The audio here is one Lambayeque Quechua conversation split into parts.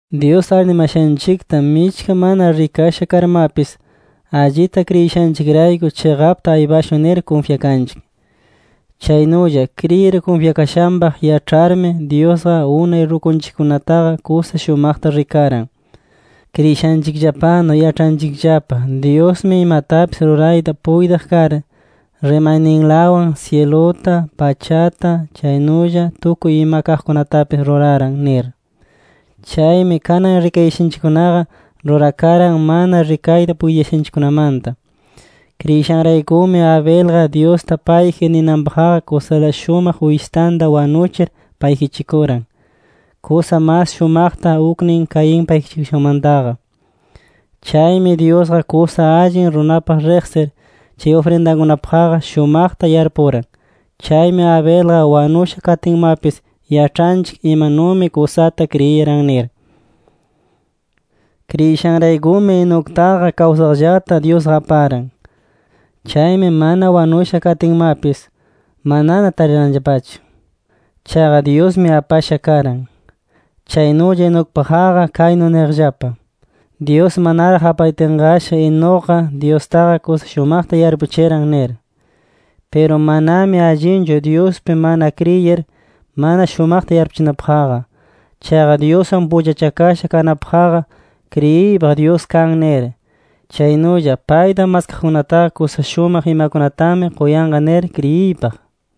Dyus arnimashanchikta michka mana rikasha karmapis, allita kriyishanchikrayku, chiqapta aypayashun nir kunfyakanchik. Chaynulla kriyir kunfyakashanpaq yaĉharmi, Dyusqa unay rukunchikkunataqa kusa shumaqta rikaran. Kriyishanchikllapanu yaĉhanchikllapa, Dyusmi imatapis rurayta puytiq kar, rimayninlawan syiluta, pachata, chaynulla tukuy ima kaqkunatapis ruraran nir. Chaymi kanan rikayashanchikkunaqa, rurakaran mana rikayta puytiyashanchikkunamanta. Kriyishanraykumi Abelqa, Dyusta payji ninanpaqqa, kusa shumaq uyshitanta wanuchir payjichikuran, kusa mas shumaqta uknin Caín payjichikushanmantaqa. Chaymi Dyusqa kusa allin runapaq riqsir, chay ufrindakunapaqqa shumaqta yarpuran. Chaymi Abelqa wanusha katinmapis, yaĉhanchik imanumi kusata kriyiran nir. Kriyishanraykumi Enoctaqa kawsaqllata Dyusqa aparan. Chaymi mana wanusha katinmapis, manana tariranllapachu. Chaqa Dyusmi apasha karan. Chaynulla Enocpaqqa kaynu niqllapa: Dyus manaraq apayatinqashi, Enocqa Dyustaqa kusa shumaqta yarpuchiran nir. Piru manami allinchu Dyuspi mana kriyir, mana shumaqta yarpuchinapaqqa. Chaqa Dyuswan pullachakasha kanapaqqa, kriyiypaq Dyusqa kan nir. Chaynulla payta maskaqkunataqa, kusa shumaq imakunatami quyanqa nir kriyiypaq.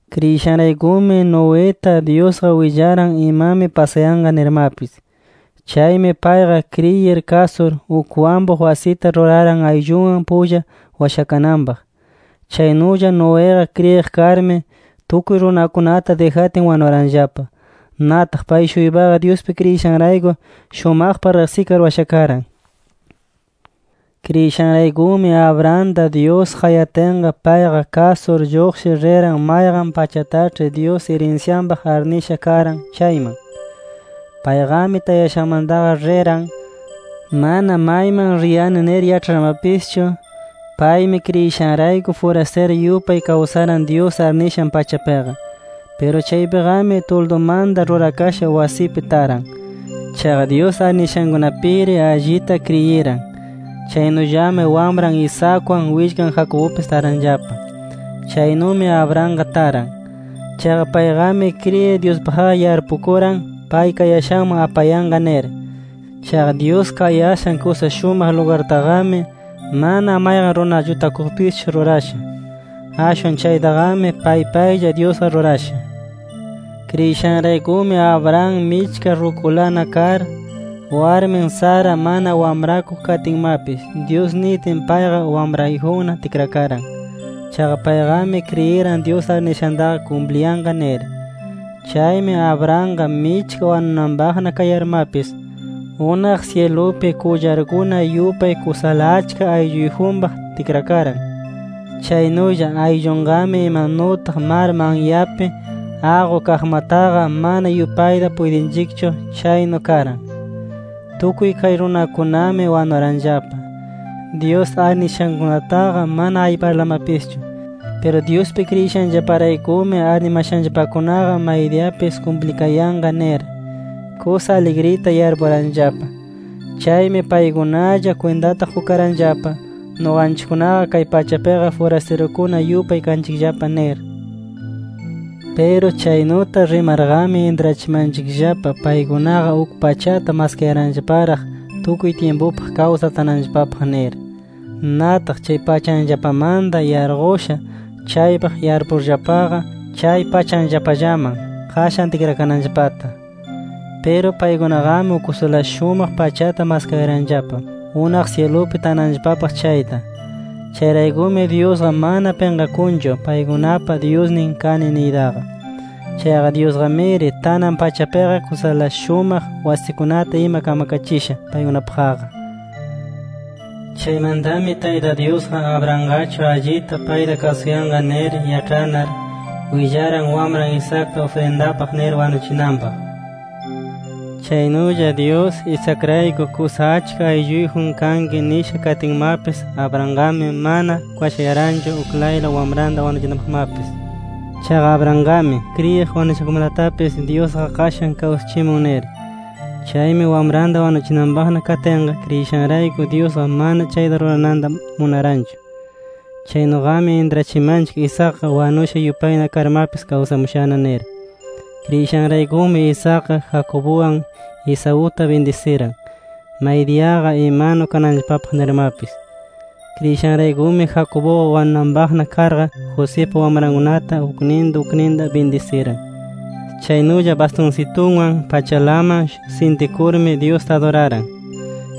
Kriyishanraykumi Noeta, Dyusqa willaran imami pasayanqa nirmapis. Chaymi payqa kriyir kasur, uk wampuq wasita ruraran ayllunwan pulla washakananpaq. Chaynulla Noeqa kriyiq karmi, tukuy runakunata dijatin wanuranllapa. Nataq pay-shuypaqa Dyuspi kriyishanrayku, shumaqpaq riqsikar washakaran. Kriyishanraykumi Abrahamta, Dyus qayatinqa, payqa kasur lluqshir riran mayqan pachataĉhi Dyus irinsyanpaq arnisha karan chayman. Payqami tayashanmantaqa riran, mana mayman riyani nir yaĉharmapischu. Paymi kriyishanrayku furastiru yupay kawsaran Dyus arnishan pachapiqa. Piru chaypiqami tuldumanta rurakasha wasipi taran. Chaqa Dyus arnishankunapiri allita kriyiran. Chaynullami wamran Isaacwan, willkan Jacobpis taranllapa. Chaynumi Abrahamqa taran. Chaqa payqami kriyir Dyuspaqqa yarpukuran pay kayashanman apayanqa nir. Chaqa Dyus kayashan kusa shumaq lugartaqami, mana mayqan runa llutakuqpischu rurasha. Ashwan chaytaqami pay paylla Dyusqa rurasha. Kriyishanraykumi Abraham michka rukulana kar, warmin Sara mana wamrakuq katinmapis, Dyus nitin payqa wamrayjunna tikrakaran. Chaqa payqami kriyiran Dyus arnishantaqa kumpliyanqa nir. Chaymi Abrahamqa michka wanunanpaqna kayarmapis, unaq syilupi qullarkuna yupay kusala achka aylluyjunpaq tikrakaran. Chaynulla ayllunqami imanutaq mar manyapi aqu kaqmataqa mana yupayta puytinchikchu, chaynu karan. Tukuy kay runakunami wanuranllapa, Dyus arnishankunataqa mana ayparlamapischu. Piru Dyuspi kriyishanllaparaykumi arnimashanllapakunaqa maydiyapis kumplikayanqa nir, kusa aligrita yarpuranllapa. Chaymi paykunalla kwintata qukaranllapa, nuqanchikkunaqa kay pachapiqa furastirukuna yupay kanchikllapa nir. Piru chaynuta rimarqami, intrachimanchikllapa paykunaqa uk pachata maskayaranllaparaq tukuy tyimpupaq kawsar tananllapapaq nir. Nataq chay pachanllapamanta yarqushan chaypaq yarpuyarllapaqa, chay pachanllapallaman qashan tikrakananllapata. Piru paykunaqami uk kusala shumaq pachata maskayaranllapa, unaq syilupi tananllapapaq chayta. Chayraykumi Dyusqa mana pinqakunchu paykunapa Dyusnin kani niytaqa. Chaqa Dyusqamiri tanan pachapiqa, kusala shumaq wasikunata ima kamkachisha paykunapaqqa. Chaymantami Tayta Dyusqa, Abrahamqachu allita payta kasuyanqa nir yaĉhanar, willaran wamran Isaacta ufrindapaq nir wanuchinanpaq. Chaynulla Dyus, Isaacrayku kusa achka aylluyjun kanki nisha katinmapis, Abrahamqami mana kwashayaranchu uklayla wamranta wanuchinanpaqmapis. Chaqa Abrahamqami kriyiq, wanushakunamatapis Dyusqa qashan kawsachimun nir. Chaymi wamranta wanuchinanpaqna katinqa, kriyishanrayku Dyusqa mana chayta rurananta munaranchu. Chaynuqami intrachimanchik, Isaacqa wanushana yupay karmapis kawsamushana nir. Kriyishanraykumi Isaacqa, Jacobwan Esauta bindisiran maydiyaqa imanu kananllapapaq nirmapis. Kriyishanraykumi Jacobqa wanunanpaqna karqa, Josipa wamrankunata ukninta ukninta bindisiran. Chaynulla bastunsitunwan pachalaman sintikurmi Dyusta aduraran.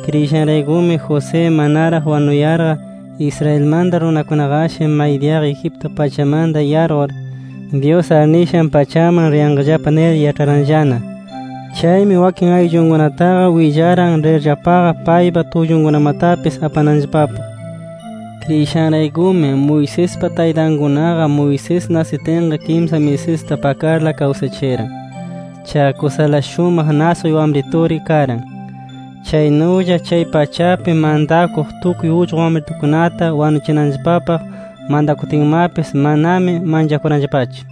Kriyishanraykumi José manaraq wanuyarqa, Israelmanta runakunaqashi maydiyaqa Egipto pachamanta yarqur, Dyus arnishan pachaman riyanqallapa nir yaĉharanllana. Chaymi wakin ayllunkunataqa willaran, rirllapaqa paypa tullunkunamatapis apananllapapaq. Kriyishanraykumi Moisespa taytankunaqa, Moisés nasitinqa kimsa misista pakarla kawsachiran. Chaqa kusala shumaq nasquy wamrituri karan. Chaynulla chay pachapi mantakuq tukuy ullqu wamritukunata wanuchinanllapapaq mantakutinmapis, manami manchakuranllapachu.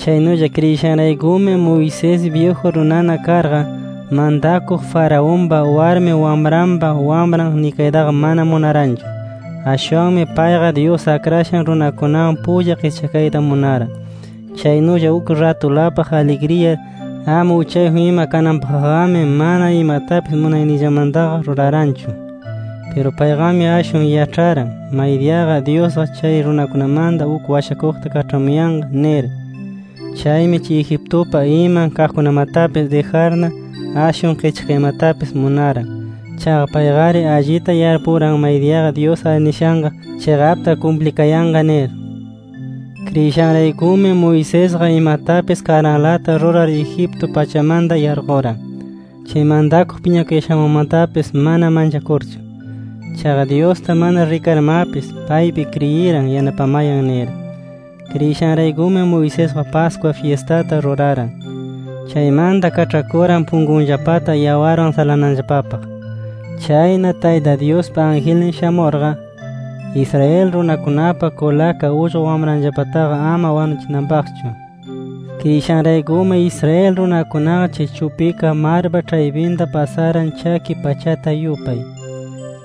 Chaynulla kriyishanraykumi Moisés byiju runana karqa, mantakuq Faraonpa warmi wamranpa wamran nikaytaqa mana munaranchu. Ashwanmi payqa, Dyus akrashan runakunawan pulla qischakayta munaran. Chaynulla uk ratulapaq aligriyar ama uchayjun ima kananpaqqami, mana imatapis munayninllamantaqa ruraranchu. Piru payqami ashwan yaĉharan, maydiyaqa Dyusqa chay runakunamanta uk washakuqta kaĉhamuyanqa nir. Chaymi chay Egiptupa iman kaqkunamatapis dijarna, ashwan qischakaymatapis munaran. Chaqa payqari allita yarpuran maydiyaqa Dyus arnishanqa chiqapta kumplikayanqa nir. Kriyishanraykumi Moisesqa imatapis karanlata rurar Egipto pachamanta yarquran, chay mantakuq piñakuyashanmanmatapis mana manchakurchu. Chaqa Dyusta mana rikarmapis, paypi kriyiran yanapayan nir. Kriyishanraykumi Moisesqa, Pascua fyistata ruraran. Chaymanta kaĉhakuran punkunllapata yawarwan salananllapapaq. Chayna Tayta Dyuspa angelnin shamurqa, Israel runakunapa kulaka ullqu wamranllapataqa ama wanuchinanpaqchu. Kriyishanraykumi Israel runakunaqa, chay chupika marpa ĉhaypinta pasaran chaki pachata yupay.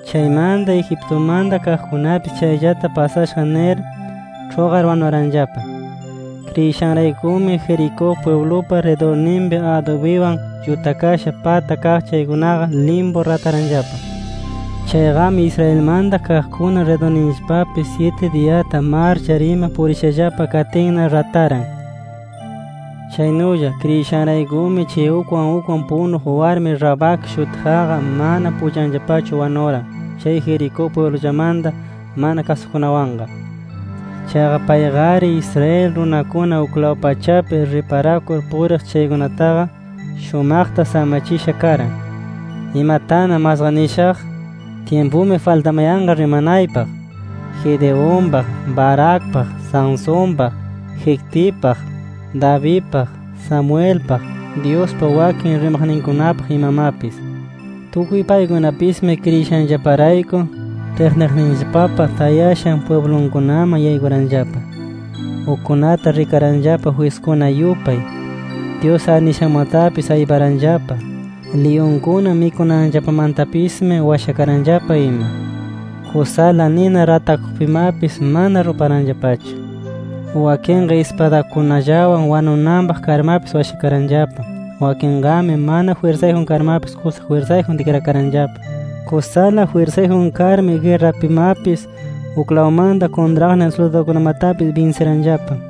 Chaymanta Egiptumanta kaqkunapis chayllata pasashaq nir, ĉhuqar wanuranllapa. Kriyishanraykumi Jericó pwiblupa ridurninpi adubiwan llutakasha pata kaq chaykunaqa limpu rataranllapa. Chayqami Israelmanta kaqkuna ridurninllapapi syiti diyata marchar ima purishallapa katinna rataran. Chaynulla kriyishanraykumi, chay ukwan ukwan punuq warmi Rahab shutiqqa, mana pullanllapachu wanuran Jericó pwiblunllamanta mana kasukuqkunawanqa. Chaqa payqari Israel runakuna uklaw pachapi riparakur puriq chaykunataqa, shumaqta samachisha karan. ¿Imatana masqa nishaq? Tyimpumi faltamayanqa rimanaypaq Gedeonpaq, Baracpaq, Sansonpaq, Jeftipaq, Davidpaq, Samuelpaq, Dyuspa wakin rimaqninkunapaq imamapis. Tukuy paykunapismi kriyishanllaparayku, ĉhiqniqninllapapa tayashan pwiblunkunaman yaykuranllapa. Ukkunata rikaranllapa jwiskuna yupay, Dyus arnishanmatapis ayparanllapa, liyunkuna mikunanllapamantapismi washakaranllapa ima. Kusala nina ratakuqpimapis mana ruparanllapachu. Wakinqa ispadakunallawan wanunanpaq karmapis washakaranllapa. Wakinqami mana jwirsayjun karmapis kusa jwirsayjun tikrakaranllapa. Kusala jwirsayjun karmi, guerrapimapis uklawmanta kuntraqnin suldadukunamatapis binsiranllapa.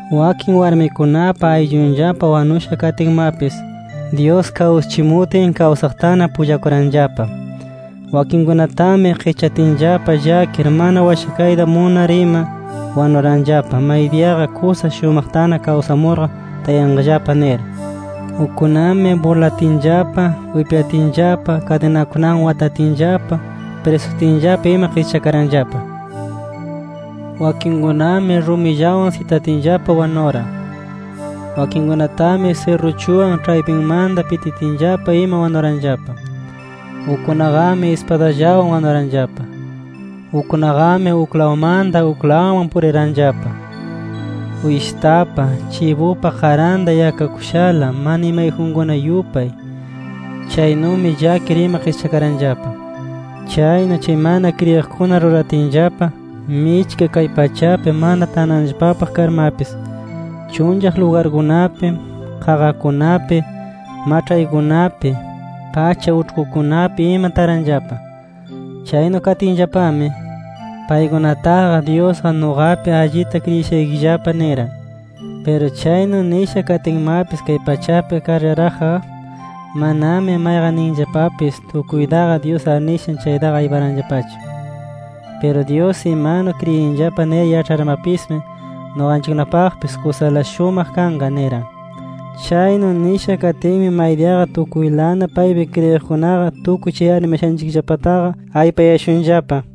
Wakin warmikunapa ayllunllapa wanusha katinmapis, Dyus kawsachimutin kawsaqtana pullakuranllapa. Wakinkunatami qischatinllapa llakir mana washakayta munar ima, wanuranllapa maydiyaqa kusa shumaqtana kawsamurqa tayanqallapa nir. Ukkunami burlatinllapa, wipyatinllapa, kadinakunawan watatinllapa, prisutinllapa ima qischakaranllapa. Wakinkunami rumillawan sitatinllapa wanuran. Wakinkunatami sirruchuwan ĉhaypinmanta pititinllapa ima wanuranllapa. Ukkunaqami ispadallawan wanuranllapa. Ukkunaqami uklawmanta uklawman puriranllapa, uyshitapa, chibupa qaranta yakakushala, mana imayjunkuna yupay. Chaynumi llakir ima qischakaranllapa. Chaynu chay mana kriyiqkuna ruratinllapa, michka kay pachapi mana tananllapapaq karmapis, chunllaq lugarkunapi, qaqakunapi, maĉhaykunapi, pacha uĉhkukunapi ima taranllapa. Chaynu katinllapami, paykunataqa Dyusqa nuqapi allita kriyishaykillapa niran. Piru chaynu nisha katinmapis kay pachapi karllaraqqa, manami mayqanninllapapis tukuytaqa Dyus arnishan chaytaqa ayparanllapachu. Piru Dyus imanu kriyinllapa nir yaĉharmapismi, nuqanchikkunapaqpis kusala shumaq kanqa niran. Chaynu nisha katinmi maydiyaqa tukuylana paypi kriyiqkunaqa tukuy chay arnimashanchikllapataqa aypayashunllapa.